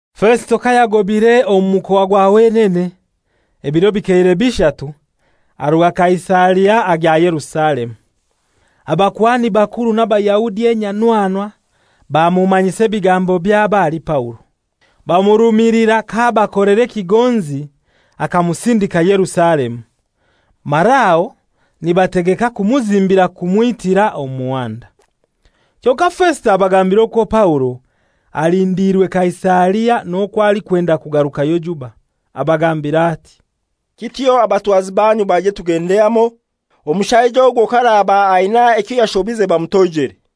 Fesito kayagobaire omu mukoa gwa wenene, ebiro bikeire bishatu, aruga Kaisaria agya Yerusalemu. Abakuhani bakuru n'Abayahudi enyanwanwa bamumanyisa ebigambo byabo ahali Paulo. Bamurumilira k'abakolera ekigonzi akamusindika Yerusalemu, mara aho nibategeka kumuzimbira kumwitira omu muhanda. Kyonkai Fesito abagambira okwo Paulo alindiirwe Kaisaria n'okwo alikwenda kugarukayo juba. Abagambira ati, «Kityo abatwazi banyu baije tugende hamoi. Omushaija ogwo k'araba aina ekyo yashobize bamutoijere.»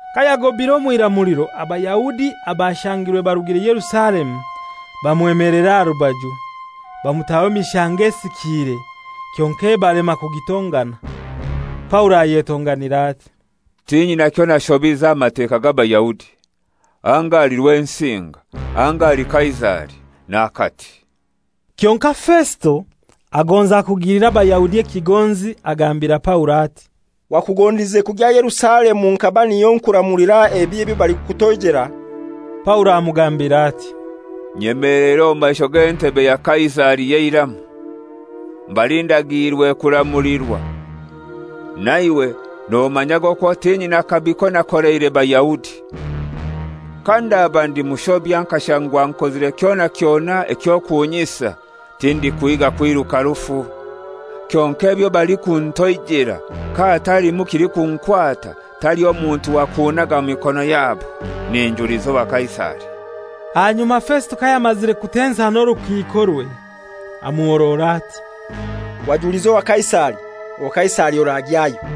Kayagobaire omw'iramuliro, Abayahudi abashangirwe barugire Yerusalemu bamwemelera aha rubaju, bamutaho emishango esikiire kyonkai ebalema kugitongana. Paulo ayetonganira ati, «Tinyina kyonashobize aha Mateka g'Abayahudi, anga ahali Rwensinga, anga ahali Kaisari; n'akati.» Kyonkai Fesito agonza kugilira Abayahudi ekigonzi agambira Paulo ati, «Wakugondize kugya Yerusalemu nkaba niyo nkuramulira ebi ebyo balikukutoijela?» Paulo amugambira ati, «Nyemeleire omu maisho g'entebe ya Kaisari y'eiramu, mbali ndagiirwe kuramulirwa. Naiwe nomanyage okwo tinyina kabi konakoleire Bayahudi. Kandaba ndi mushobya nkashangwa nkozire kyona kyona eky'okunyisa, tindikuhiiga kwiruka rufu. Kyonkai ebyo balikuntoijela kahatalimu kilikunkwata, taliho muntu wa kunnaga mu mikono yabo. Ninjuliza owa Kaisari.» Ahanyuma Fesito kayamazire kutensa n'orukiikorwe, amuhorora ati, «Wajuliza owa Kaisari, owa Kaisari oragyayo.»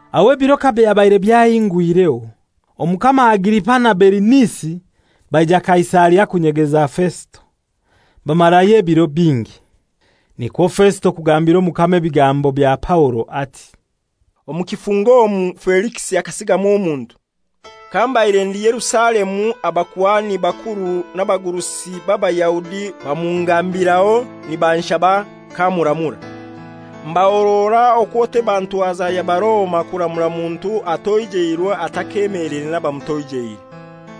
Aho ebiro kabyabaire byahingwireho, Omukama Agripa na Berinisi baija Kaisaria kunyegeza Fesito. Bamarayo ebiro bingi. Nikwo Fesito kugambira omukama ebigambo bya Paulo ati, «Omu kifungo omu Felikisi akasigamu omuntu. Kambaire ndi Yerusalemu abakuhani bakuru n'abagurusi b'Abayahudi bamungambiraho nibanshaba kamuramura. Mbahorora okwo teba ntwaza ya Baroma kuramura muntu atoijeirwe atakemeleire n'abamutoijeire,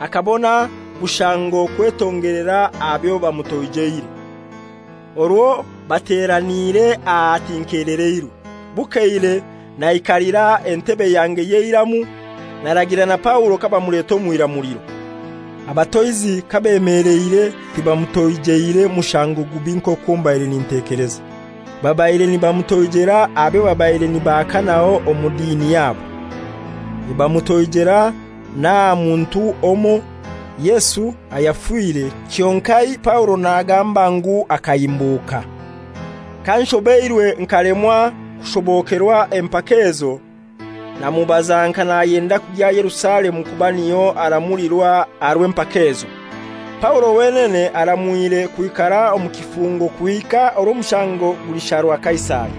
akabona bushango kwetongelera aha byo bamutoijeire. Orwo bateraniire aha, tinkeleleirwe. Bukeire naikalira entebe yange y'eiramu, naragira na Paulo kabamuleta omw'iramuliro. Abatoizi kabemeleire tibamutoijeire mushango gubi nk'okwo mbaire nintekeleza. Babaire nibamutoijela aha byo babaire nibahakanaho omu dini yabo, nibamutoijela n'aha muntu omoi, Yesu, ayafire kyonkai Paulo nagamba ngu akahimbuka. Kanshobeirwe nkalemwa kushobokerwa empaka ezo, namubaza nka nayenda kugya Yerusalemu kuba niyo aramulirwa aha rw'empaka ezo. Paulo wenene aramwire kwikara omu kifungo kuhika orwo omushango gulisharwa Kaisari.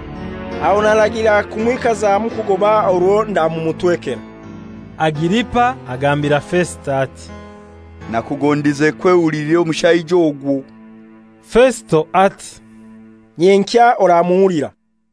Aho naragira kumwikazamu kugoba orwo ndamumutwekera.» Agiripa agambira Fesito ati, «Nakugondize kwehulilira omushaija ogwo.» Fesito ati, «Nyenkya oramuhulira.»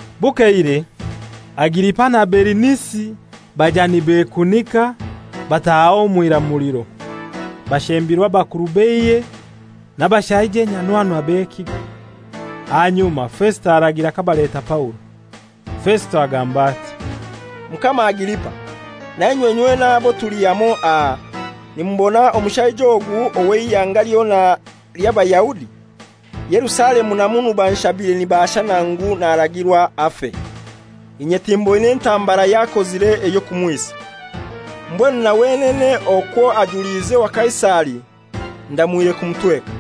Bukeire Agiripa na Berinisi baija nibekunika, bataha omw'iramuliro, bashembirwe abakuru b'eihe n'abashaija enyanwanwa b'ekigo. Ahanyuma Fesito aragira kabaleta Paulo. Fesito agamba ati, «Mukama Agiripa nainywe nywena abo tuli hamoi aha, nimubona omushaija ogu ow'eihanga lyona ly'Abayahudi, Yerusalemu na munu banshabire nibaashana ngu naragirwa afe. Inye timboine ntambara y'akozire ey'okumwisa. Mbwenu na wenene okwo ajuliize owa Kaisari, ndamwire kumutweka.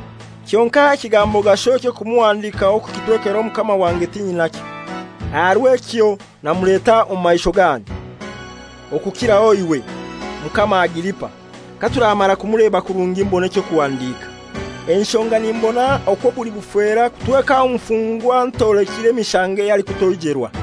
Kyonkai ekigambo gasho eky'okumuhandikaho kukitwekera mukama wange tinyinakyo. Aha rw'ekyo namuleta omu maisho ganyu, okukiraho iwe, Mukama Agiripa, katuramara kumuleba kurungi mbone eky'okuhandika. Enshonga nimbona okwo buli bufera kutweka omufungwa ntolekire mishango ey'alikutoijerwa.»